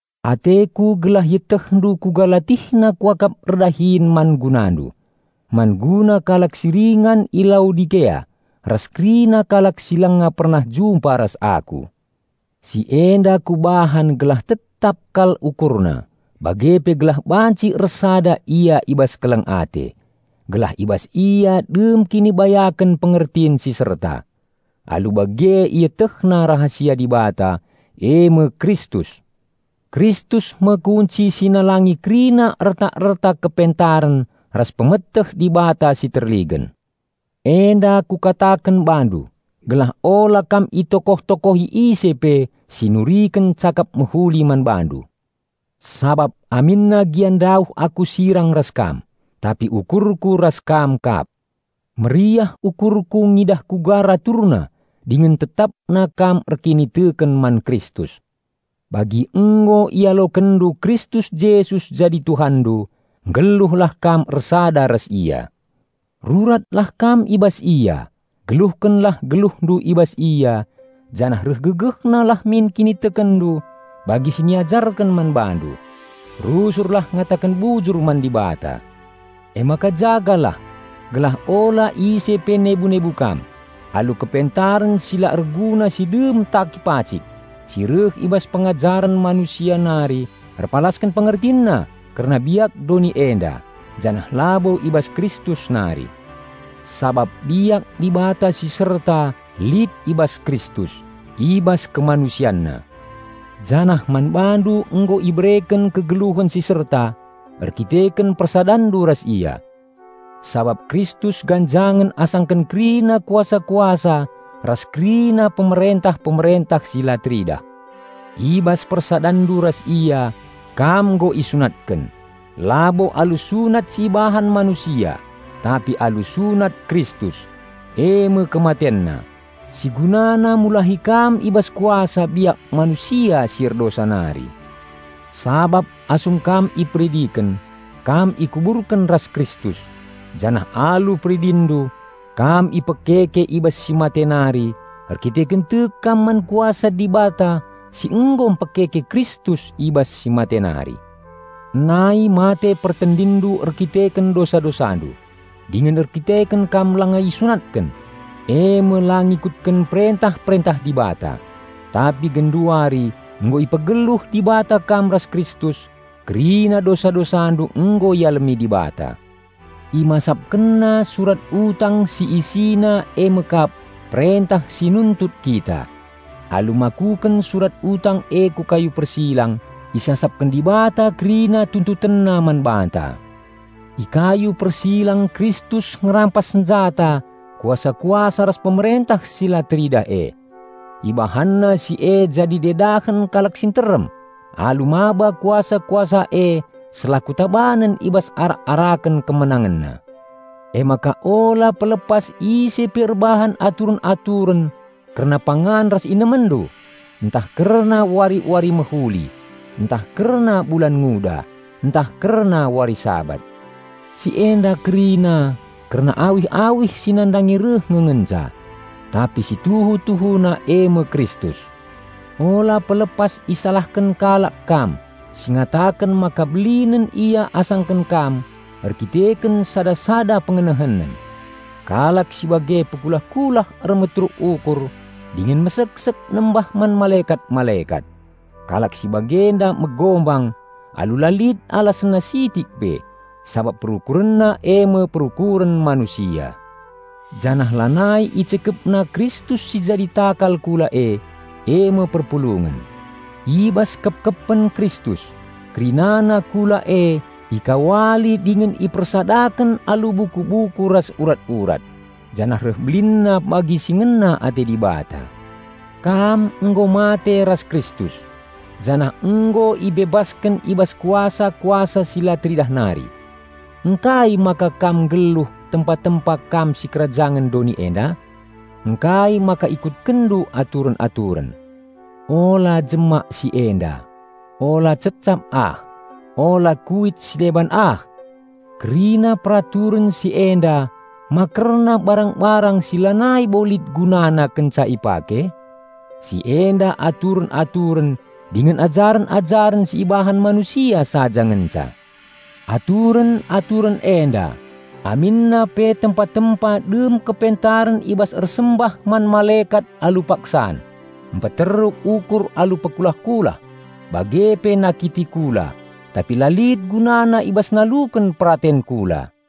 Ateku gelah ietehndu kuga latihna kuakap erdahin man gunandu, man guna kalak si ringan i Laodikea ras kerina kalak si langa pernah jumpa ras aku. Si enda kubahan gelah tetap kal ukurna bage pe gelah banci ersada ia i bas keleng ate, gelah i bas ia dem kinibayaken pengertin si serta. Alu bage ietehna rahasia Dibata, eme Kristus. Kristus me kunci si nalangi kerina erta-erta kepentaren ras pemeteh Dibata si terligen. Enda kukataken bandu gelah ola kam itokoh-tokohi ise pe si nuriken cakap mehuli man bandu. Sabap aminna gia ndauh aku sirang ras kam, tapi ukurku ras kam kap. Meriah ukurku ngidah uga raturna dingen tetapna kam erkiniteken man Kristus. Bagi nggo ialokenndu Kristus Jesus jadi Tuhanndu, nggeluhlah kam ersada ras Ia. Ruratlah kam i bas Ia, geluhkenlah geluhndu i bas Ia, janah reh gegehna lah min kinitekenndu bagi si niajarken man bandu. Rusurlah ngataken bujur man Dibata. Emaka jagalah, gelah ola ise pe nebu-nebu kam, alu kepentaren si la erguna si dem taki pacik, si reh i bas pengajaren manusia nari erpalasken pengertinna kerna biak doni enda, janah labo i bas Kristus nari. Sabap biak Dibata si serta lit i bas Kristus, i bas KemanusianNa. Janah man bandu nggo ibereken kegeluhen si serta erdandanken persadanndu ras Ia. Sabap Kristus ganjangen asaken kerina kuasa-kuasa ras kerina pemerentah-pemerentah si la teridah. I bas persadanndu ras Ia kam nggo isunatken, labo alu sunat si ibahan manusia, tapi alu sunat Kristus, eme KematenNa, si gunana mulahi kam i bas kuasa biak manusia si erdosa nari. Sabap asum kam iperidiken, ikuburkenndu ras Kristus, janah alu peridinndu ipekekendu i bas si mate nari erdandanken tek kam man kuasa Dibata si nggo pekeke Kristus i bas si mate nari. Nai mate pertendinndu erdandanken dosa-dosandu, dingen erdandanken kam langa isunatken, eme la ngikutken perentah-perentah Dibata. Tapi genduari nggo ipegeluh Dibata kam ras Kristus, kerina dosa-dosandu nggo ialemi Dibata. ImasapkenNa surat utang si isina eme kap perentah si nuntut kita. Alu makuken surat utang e ku kayu persilang, isasapken Dibata kerina TuntutenNa man banta. I kayu persilang Kristus ngerampas senjata kuasa-kuasa ras pemerentah si la teridah e. IbahanNa si e jadi dedahen kalak si nterem alu maba kuasa-kuasa e selaku tabanen i bas arak-araken KemenangenNa. Emaka ula pelepas ise pe erbahan aturen-aturen kerna pangan ras inemenndu, ntah kerna wari-wari mehuli, ntah kerna bulan nguda, ntah kerna wari Sabat. Si enda kerina kerna awih-awih si nandangi reh nge ngenca. Tapi si tuhu-tuhuna eme Kristus. Ula pelepas isalahken kalak kam si ngataken maka belinen ia asangken kam erkiteken sada-sada pengenehenen. Kalak si bage pekulah-kulah ermeteruk ukur dingen meseksek nembah man malekat-malekat. Kalak si bagenda megombang alu la lit alasenna sitik pe, sabap perukurenna eme perukuren manusia. Janah lanai icikepna Kristus si jadi takal kula e, eme perpulungen. I bas kepkepen Kristus, kerinana kula e ikawali dingen ipersadaken alu buku-buku ras urat-urat, janah reh belinna bagi si ngena ate Dibata. Kam nggo mate ras Kristus, janah nggo ibebasken i bas kuasa-kuasa si la teridah nari. Ngkai maka kam nggeluh tempa-tempa kam sikerajangen doni enda? Ngkai maka ikutkenndu aturen-aturen: "Ula jemak si enda," "Ula cecap ah," "Ula kuit si deban ah!" Kerina peraturen si enda ma kerna barang-barang si lanai bo lit gunana kenca ipake? Si enda aturen-aturen dingen ajaren-ajaren si ibahan manusia saja ngenca. Aturen-aturen enda, aminna pe tempa-tempa dem kepentaren i bas ersembah man malekat alu paksan, mpeteruk ukur alu pekulah-kulah, bage pe nakiti kula, tapi la lit gunana i bas naluken peraten kula.